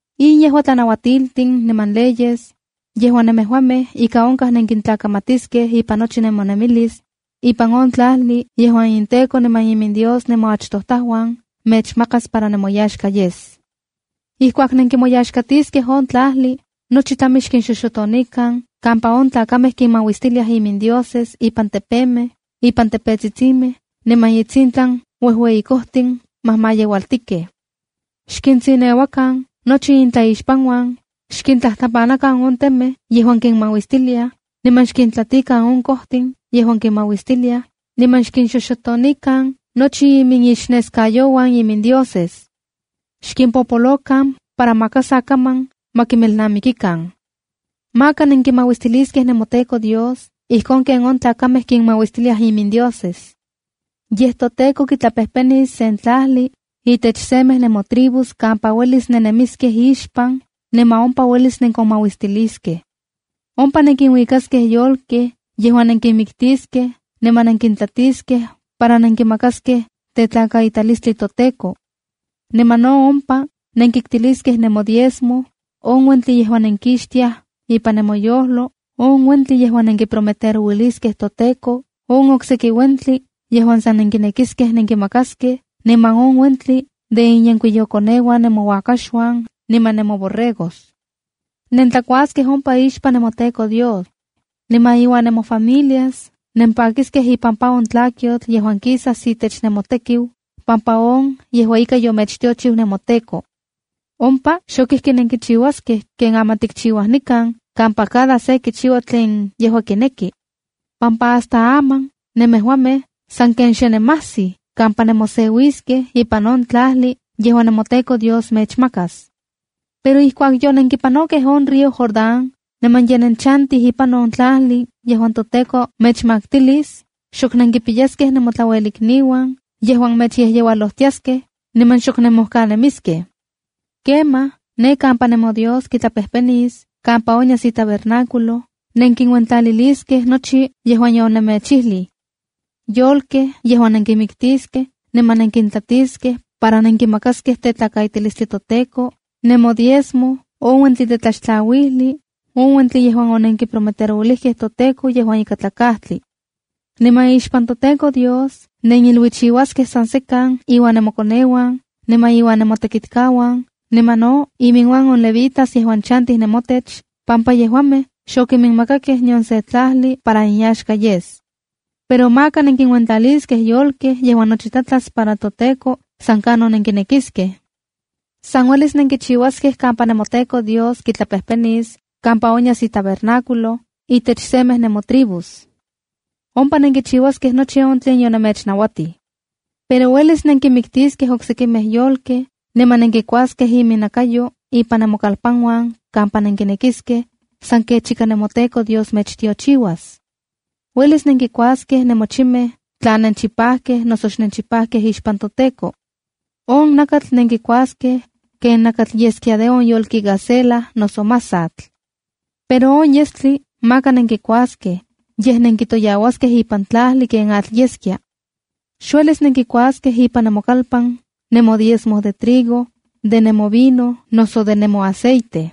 ’In yejua tlanauatiltin niman leyes, yejuan nemejuamej ika onkaj nenkintlakamatiskej ipan nochi nemonemilis, ipan on tlajli yejuan inTEKO niman inDios nemoachtojtajuan mechmakas para nemoyaxka yes. ’Ijkuak nenkimoyaxkatiskej on tlajli, nochi tlami xkinxoxotonikan kampa on tlakamej kinmauistiliaj imindioses ipan tepemej, ipan tepetsitsimej niman itsintlan uejueyi kojtin majmajyeualtikej. Xkintsineuakan nochi intlaixpanuan, xkintlajtlapanakan on temej yejuan kinmauistiliaj, niman xkintlatikan on kojtin yejuan kinmauistiliaj, niman xkinxoxotonikan nochi iminixneskayouan imindioses. Xkimpopolokan para maka sa kaman ma kimelnamikikan. ’Maka nenkimauistiliskej nemoTEKO Dios ijkon ken on tlakamej kinmauistiliaj imindioses. Yej toTEKO kitlapejpenis sen tlajli itech semej nemotribus kampa uelis nennemiskej ixpan, niman ompa uelis nenkonmauistiliskej. Ompa nenkinuikaskej yolkej yejuan nenkinmiktiskej niman nenkintlatiskej para nenkimakaskej tetlakaitalistli toTEKO. Niman no ompa nenkiktiliskej nemodiezmo, on uentli yejuan nenkixtiaj impan nemoyojlo, on uentli yejuan nenkiprometerouiliskej toTEKO, on oksekij uentli yejuan san nenkinekiskej nenkimakaskej, niman on uentli de inyenkuiyokoneuan nemouakaxuan niman nemoborregos. Nentlakuaskej ompa ixpan nemoTEKO Dios. Niman iuan nemofamilias nempakiskej ipampa on tlakyotl yejuan kisas itech nemotekiu pampa on yejua ika yomechtiochiu nemoTEKO. ’Ompa xok ijki nenkichiuaskej ken aman tikchiuaj nikan kampa cada se kichiua tlen yejua kineki, pampa hasta aman nemejuamej sanken xenemajsij kampa nemoseuiskej ipan on tlajli yejuan nemoTEKO Dios mechmakas. Pero ijkuak yonenkipanokej on río Jordán niman ye nenchantij ipan on tlajli yejuan toTEKO mechmaktilis, xok nenkipiyaskej nemotlauelikniuan yejuan mechyejyeualojtiaskej, niman xok nenmojkanemiskej. Kemaj ne kampa nemoTEKO Dios kitlapejpenis kampa onyas itabernáculo kampa kitlakaitaskej itokatsin, nenkiuentlaliliskej nochi yejuan yonemechijlij: yolkej yejuan nenkinmiktiskej niman nenkintlatiskej para nenkimakaskej tetlakaitalistli toTEKO, nemodiezmo, on uentli de tlaxtlauali, on uentli yejuan onenkiprometerouilijkej toTEKO yejuan ikatlakajtli. Niman ixpan nemoTEKO Dios neniluichiuaskej san sekan iuan nemokoneuan niman iuan nemotekitkauan, niman no iminuan on levitas yejuan chantij nemotech pampa yejuamej xokiminmakakej nion sen tlajli para inyaxka yes. ’Pero maka nenkinuentlaliskej yolkej yejuan nochi tlatlas para toTEKO san kanon nenkinekiskej. San uelis nenkichiuaskej kampa nemoTEKO Dios kitlapejpenis kampa onyas itabernáculo itech semej nemotribus. Ompa nenkichiuaskej nochi on tlen yonemechnauatij. ’Pero uelis nenkinmiktiskej oksekimej yolkej, niman nenkikuaskej iminnakayo ipan nemokalpanuan kaman nenkinekiskej, san kech ika nemoTEKO Dios mechtiochiuas. Uelis nenkikuaskej nemochimej tla nenchipajkej noso xnenchipajkej ixpan toTEKO. On nakatl nenkikuaskej, ken nakatl yeskia de on yolki itoka gacela noso masatl. Pero on yestli maka nenkikuaskej, yej nenkitoyauaskej ipan tlajli ken atl yeskia. ’Xuelis nenkikuaskej ipan nemokalpan nemodiezmo de trigo, de nemovino, noso de nemoaceite.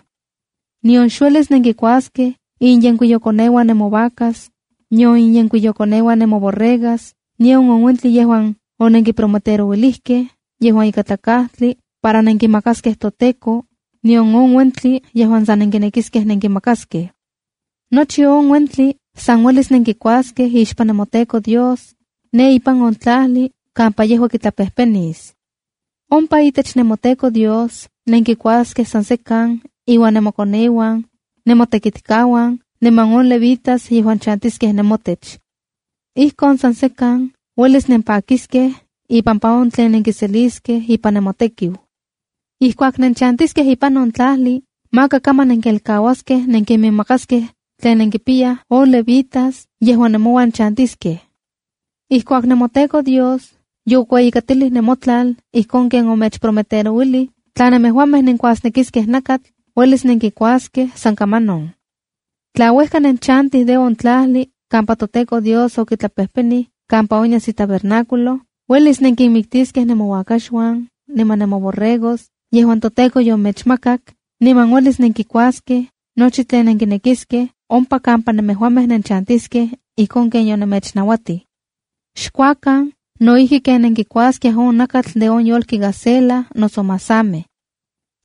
Nion xuelis nenkikuaskej inyenkuiyokoneuan nemovacas, nion inyenkuiyokoneuan nemoborregas, nion on uentli yejuan onenkiprometerouilijkej yejuan ikatlakajtli para nenkimakaskej toTEKO, nion on uentli yejuan san nenkinekiskej nenkimakaskej. Nochi on uentli san uelis nenkikuaskej ixpan nemoTEKO Dios, ne ipan on tlajli kampa yejua kitlapejpenis. Ompa itech nemoTEKO Dios nenkikuaskej san sekan iuan nemokoneuan, nemotekitkauan niman on levitas yejuan chantiskej nemouan. Ijkon san sekan uelis nempakiskej ipampa on tlen nenkiseliskej ipan nemotekiu. Ijkuak nenchantiskej ipan on tlajli, maka kaman nenkelkauaskej nenkiminmakaskej tlen nenkipiyaj on levitas yejuan nemouan chantiskej. ’Ijkuak nemoTEKO Dios yokueyikatilij nemotlal ijkon ken omechprometerouilij, tla nemejuamej nenkuasnekiskej nakatl, uelis nenkikuaskej san kamanon. Tla uejka nenchantij de on tlajli kampa toTEKO Dios okitlapejpeni kampa onyas itabernáculo, uelis nenkinmiktiskej nemouakaxuan, niman nemoborregos yejuan toTEKO yomechmakak, niman uelis nenkikuaskej nochi tlen nenkinekiskej ompa kampa nemejuamej nenchantiskej ijkon ken yonemechnauatij. Xkuakan no ijki ken nenkikuaskiaj on nakatl de on yolki gacela noso masamej.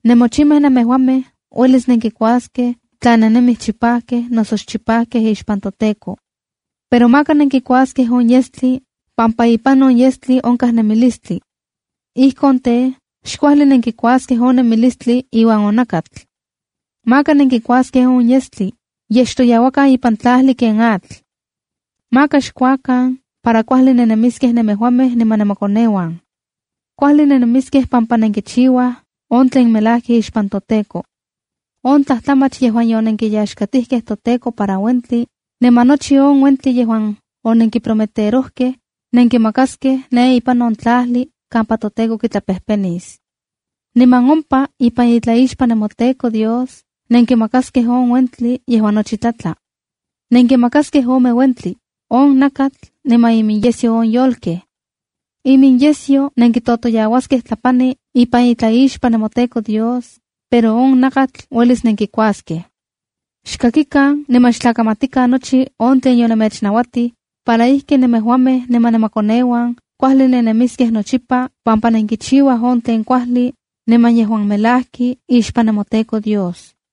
Nemochimej nemejuamej uelis nenkikuaskej, tla nennemij chipajkej noso xchipajkej ixpan toTEKO. Pero maka nenkikuaskej on yestli, pampa ipan on yestli onkaj nemilistli. Ijkon tej, xkuajli nenkikuaskej on nemilistli iuan on nakatl. Maka nenkikuaskej on yestli, yej xtoyauakan ipan tlajli ken atl. Maka xkuakan para kuajli nennemiskej nemejuamej niman nemokoneuan. Kuajli nennemiskej pampa nenkichiuaj on tlen melajki ixpan toTEKO. On tlajtlamach yejuan yonenkiyaxkatijkej toTEKO para uentli, niman nochi on uentli yejuan onenkiprometerojkej, nenkimakaskej ne ipan on tlajli kampa toTEKO kitlapejpenis. Niman ompa ipan itlaixpan nemoTEKO Dios nenkimakaskej on uentli yejuan nochi tlatla. Nenkimakaskej ome uentli, on nakatl niman iminyesyo on yolkej. Iminyesyo nenkitotoyauaskej tlapani ipan itlaixpan nemoTEKO Dios, pero on nakatl uelis nenkikuaskej. ’Xkakikan niman xtlakamatikan nochi on tlen yonemechnauatij, para ijki nemejuamej niman nemokoneuan kuajli nennemiskej nochipa, pampa nenkichiuaj on tlen kuajli, niman yejuan melajki ixpan nemoTEKO Dios.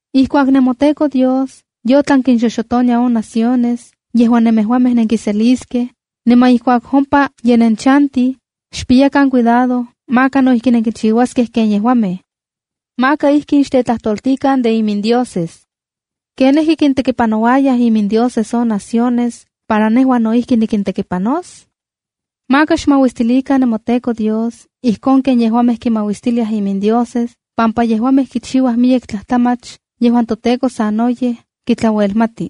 ’Ijkuak nemoTEKO Dios yotlan kinxoxotonia on naciones yejuan nemejuamej nenkiseliskej, niman ijkuak ompa ye nenchantij, xpiyakan cuidado maka no ijki nenkichiuaskej ken yejuamej. Maka ijkin xtetlajtoltikan de imindioses: “¿Ken ijki kintekipanouayaj imindioses on naciones para nejua no ijki nikintekipanos?” Maka xmauistilikan nemoTEKO Dios ijkon ken yejuamej kinmauistiliaj imindioses pampa yejuamej kichiuaj miyek tlajtlamach yejuan toTEKO sanoyej kitlauelmati.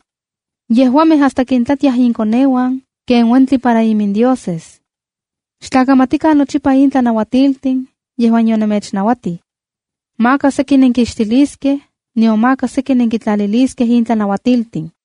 Yejuamej hasta kintlatiaj inkoneuan ken uentin para imindioses. ’Xtlakamatikan nochipa in tlanauatiltin yejuan yonemechnauatij. Maka seki nenkixtiliskej, nion maka seki nenkitlaliliskej in tlanauatiltin.